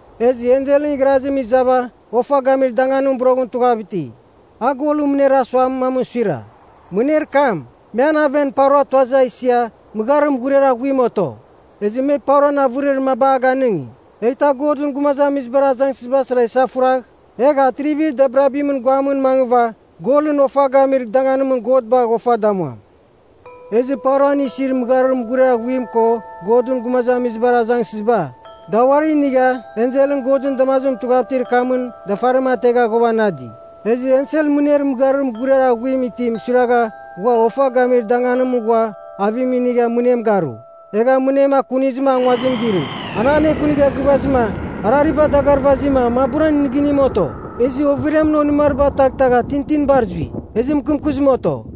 Ezɨ enselɨn igharazim iza ofa gamir danganim boroghɨn tughav iti. A golɨn mɨner mamɨn suira, mɨner kam, me an aven paura tuazɨ a isia mɨgharir mughuriar aghuim oto. Ezɨ me pauran avɨrir maba a ganɨngi, eghtɨ a Godɨn gumazamizibar azangsɨzibar sara isafuragh, egh atrivir dabirabimɨn guamɨn mangɨva golɨn ofa gamir danganimɨn God bagh ofa damuam. Ezɨ pauran isir mɨgharir mughuriar aghuim ko Godɨn gumazamizibar azangsɨziba, da uari inigha enselɨn Godɨn damazimɨn tughav itir kamɨn dafarim ategha ghuavanadi. Ezɨ ensel mɨner mɨgharir mughuriar aghuim itim suiragha ghua ofa gamir danganimɨn ghua avim inigha mɨnem garu, egha mɨnem akunizɨma a nguazim girɨ. An anekunigha gɨvazɨma, arariba dagarvazima maburan nɨgɨnim oto, ezɨ overiamɨn onɨmariba taghtagha tintinibar zui, ezɨ mɨkɨmkɨzim oto.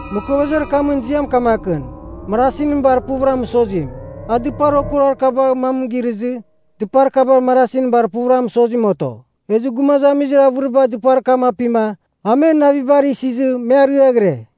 Mɨkovezir kamɨn ziam kamakɨn, Marasinɨn Bar Puvɨra Mɨsozim. A dɨpar okuruar kabar mam girɨzɨ, dɨpar kaba Marasinɨn Bar Puvɨra Mɨsozimɨn oto. Ezɨ gumazamizir avɨriba dɨpar kam apima a men navibar isizɨ me ariaghɨre.